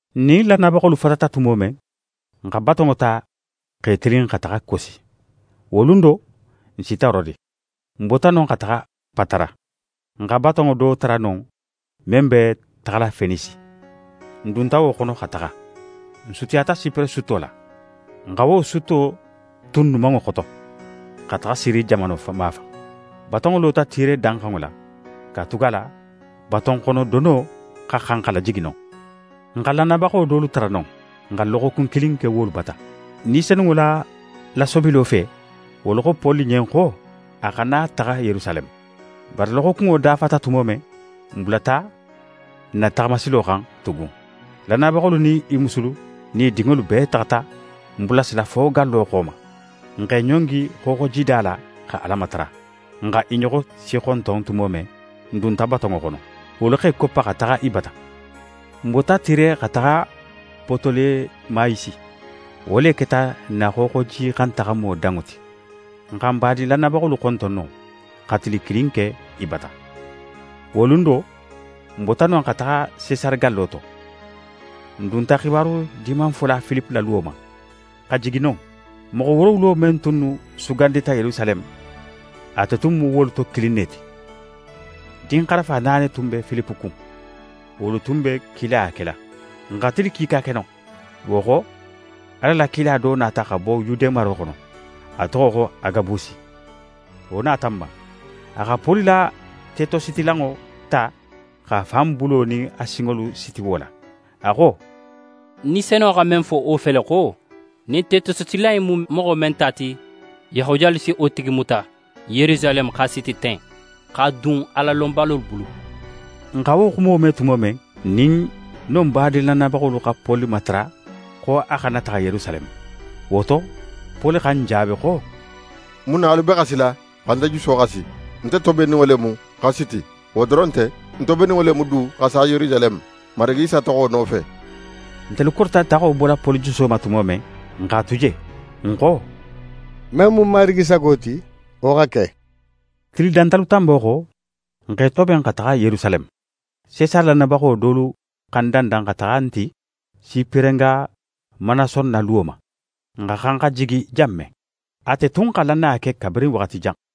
N nin lannayabaxolu fatata tumo men, n xa batonŋo ta x'e tilin xa taxa Kosi. Wo lun do, n sita Rode. N bota non xa taxa Patara. N xa batonŋo do tara non men be taxala Fenisi. N dunta wo xono xa taxa. N sutiyata Sipere sutto la. N xa wo sutto tu n numanŋo xoto, xa taxa Siri jamano mafan. Batonŋo lota Tire danxanŋo la, katugala batonxonodono xa xan xa lajigi non. N xa lannayabaxo dolu tara non. N xa loxokun kilin ke wolu bata. Ni Senunŋo la lasobilo fe, wolu xo Poli ɲen xo a xana taxa Yerusaleme. Bari loxokunŋo dafata tumo men, n bulata n na taxamasilo xan tugun. Lannayabaxolu nin i musulu nin i dinŋolu bee taxata n bulasila fo gallo xo ma. N x'e ɲongi xooxojida la xa Ala matara. N xa i ɲoxo sixonton tumo men, n dunta batonŋo xono. Wolu x'e koppa xa taxa i bata. N bota Tire xa taxa Potolemayisi. Wo le keta n na xooxojixantaxamo danŋo ti. N xa badin lannayabaxolu xonton non, xa tili kilin ke i bata. Wo lun do, n bota non xa taxa Sesare gallo to. N dunta xibaru Dimanfola Filipe la luwo ma, xa jigi non. Moxo woorowulo men tunnu sugandita Yerusaleme, ate tun mu wolu to kilin ne ti. Dinxarafa naani tun be Filipe kun, wolu tunnu be kilaya kela. N xa tili kiika ke non. Wo xo, Ala la kila do nata xa bo Yude maro xono, a toxo xo Agabusi. Wo nata n ma. A xa Poli la tetositilanŋo ta x'a fan bulo nin a sinŋolu siti wo la. A xo: «Ni Senunŋo xa men fo wo fele xo: “Ɲin tetositilan in mu moxo men ta ti, Yahudiyalu si wo tigi muta Yerusaleme x'a siti ten, x'a dun Alalonbalolu bulu.”» N xa wo xumo me tumo men, n nin non badin lannayabaxolu xa Poli matara xo a xana taxa Yerusaleme. Wo to, Poli xa n jaabi xo: «Mun na alu be xasila, xa nte juso xasi? Nte tobenninŋo le mu xa siti. Wo doron nte, ń tobenninŋo le mu du xa sa Yerusaleme, Marigi Isa toxo nofe.» Ntelu korita taxo bola Poli juso ma tumo men, n x'a tu je. N xo: «Men mu Marigi sago ti, wo xa ke.» Tili dantalu tanbo xo, n x'e toben xa taxa Yerusaleme. Sesare lannayabaxo dolu xa n dandan xa taxa n ti Siperenga Manason na luwo ma, n xa xan xa jigi jan men. Ate tun xa lannaya ke kabirin waxati jan.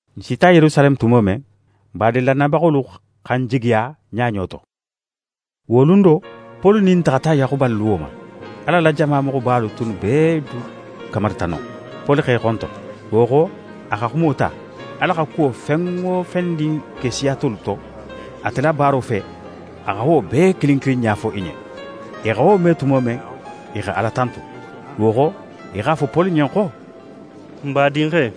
N sita Yerusaleme tumo men, badin lannayabaxolu xa n jigiya ɲaɲo to. Wo lun do, Poli nin n taxata Yaxuba la luwo ma. Ala la jama moxobalu tunnu bee du kamarita non. Poli x'e xonton. Wo xo, a xa xumo ta, Ala xa kuwo fen wo fendin ke siya tolu to, ate la baaro fe, a xa wo bee kilin kilin ɲafo i ɲen. I xa wo me tumo men, i xa Ala tantu. Wo xo, i x'a fo Poli ɲen xo: «N badinxe,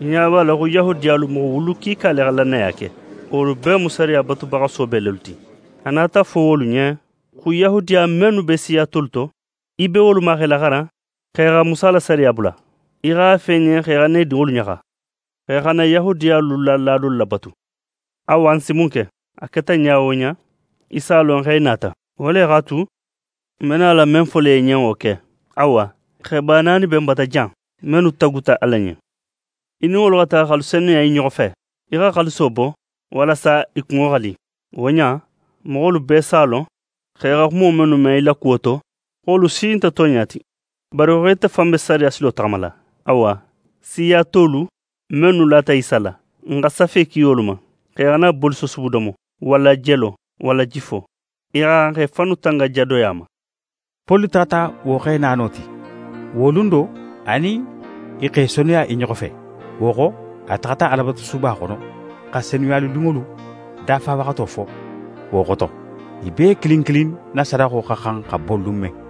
í ɲa b'a la xo Yahudiyalu moxo wulu kiika le xa lannaya ke. Wolu bee mu sariya batubaxa soobe lelu ti. A nata fo wolu ɲen xo Yahudiya mennu be siya tolu to, í be wolu ma x'e laxaran xo i xa Musa la sariya bula. Í x'a fo i ɲen xo i xana i dinŋolu ɲaxa, xo i xana Yahudiyalu la laadolu labatu. Awa, n si mun ke? A keta ɲa wo ɲa, i s'a lon xo í nata. Wo le x'a tu, n be nala men fola í ɲen, wo ke. Awa, xeba naani be n bata jan, mennu taguta Ala ɲen. Í nin wolu xa taxa x'alu senuya i ɲoxo fe. Í xa xaaliso bo walasa i kunŋo xa li. Wo ɲa in, moxolu bee si a lon xo i xa xumo mennu me í la kuwo to, xo wolu si nte tonɲa ti, bari xo ite fan be sariya silo taxamala. Awa, siya tolu mennu lata Isa la, n xa safe ki wolu ma xo i xana bolisosubu domo, walla jelo, walla jifo. I xa xan xa i fannu tanga jadoya ma.» Poli taxata wo xe naano ti. Wo lun do, a nin i x'e senuya i ɲoxo fe. Wo xo, a taxata Alabatusuba xono xa senuyalilunŋolu dafawaxato fo, wo xoto, i bee kilin kilin na sadaxo xa xan xa bo lun men.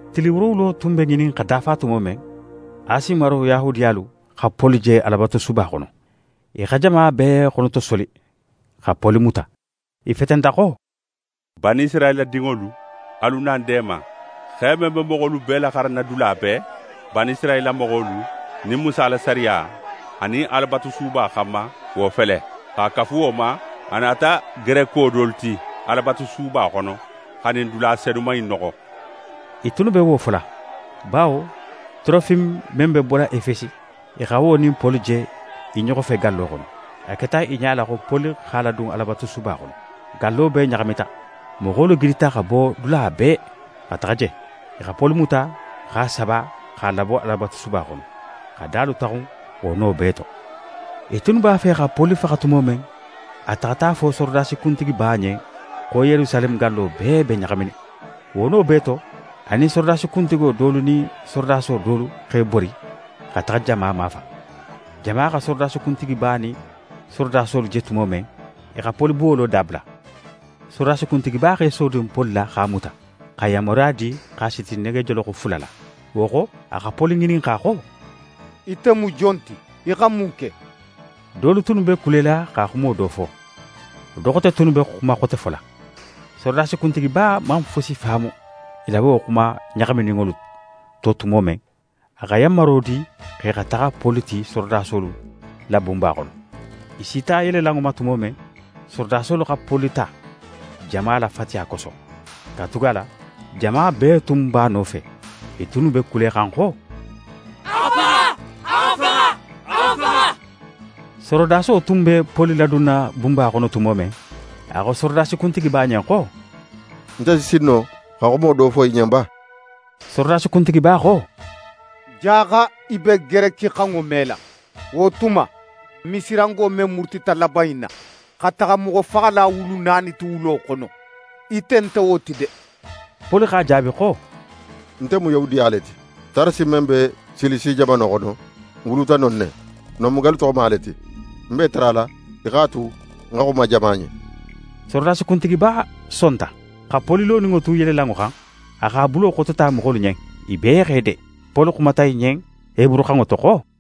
Tili woorowulo tun be ŋinin xa dafa tumo men, Asi maro Yahudiyalu xa Poli je Alabatusuba xono. I xa jama bee xonotosoli xa Poli muta. I fetenta xo: «Banisirayila dinŋolu, alu na n deema! Xe men be moxolu bee laxaranna dula bee, Banisirayila moxolu nin Musa la sariya, anin Alabatusuba xanma, wo fele. X'a kafu wo ma, a nata Gereko dolu ti Alabatusuba xono xa ɲin dula senuman in noxo.» I tunnu be wo fola, bawo Torofime men be bola Efesi, i xa wo nin Poli je i ɲoxo fe gallo xono. A keta i ɲala xo Poli x'a ladun Alabatusuba xono. Gallo bee ɲaxamita. Moxolu gidita xa bo dula bee xa taxa je. I xa Poli muta x'a saba x'a labo Alabatusuba xono, xa dalu taxun wo no bee to. I tunnu b'a fe xa Poli faxa tumo men, a taxata fo sorodasi kuntigiba ɲen xo Yerusaleme gallo bee be ɲaxaminin. Wo no bee to, a nin sorodasi kuntigo dolu nin sorodaso dolu x'e bori xa taxa jama mafan. Jama xa sorodasi kuntigiba nin sorodasolu je tumo men, i xa Poli buwolo dabula. Sorodasi kuntigiba x'é sodun Poli la x'a muta, xa yanmaruya di x'a siti negejoloxo fula la. Wo xo, a xa Poli ŋininxa xo: «Ite mu jon ti? Í xa mun ke?» Dolu tunnu be kulela xa xumo do fo, do xote tunnu be xuma xote fola. Sorodasi kuntigiba man fusi faamu i la wo xuma ɲaxamininŋolu to tumo men, a xa yanmaro di x'e xa taxa Poli ti sorodasolu la bunba xono. I sita yelelanŋo ma tumo men, sorodasolu xa Poli ta jama la fatiya koso, katugala jama bee tun b'a nofe, i tunnu be kulexan xo: «A xa faxa!» Sorodaso tunnu be Poli ladunna bunba xono tumo men, a xo sorodasi kuntigiba ɲen xo: «Nte si sin no xa xumo do fo í ɲen ba?» Sorodasi kuntigiba xo: «Jaxa í be gerekixanŋo mela. Wo tuma, Misirango men murutita laban in na, xa taxa moxofaxala wulu naani ti wulo xono, ite nte wo ti de?» Poli x'a jaabi xo: «Nte mu Yahudiya le ti. Tarasi men be Silisi jamano xono, ń wuluta non ne. Non mu gallu toxoma le ti. Ń b'é tarala í x'a tu ń xa xuma jama ɲen.» Sorodasi kuntigiba sonta. Xa Poli loninŋo tu yelelanŋo xan, a x'a bulo xotota moxolu ɲen. I bee x'e de. Poli xumata i ɲen heburuxanŋo to xo: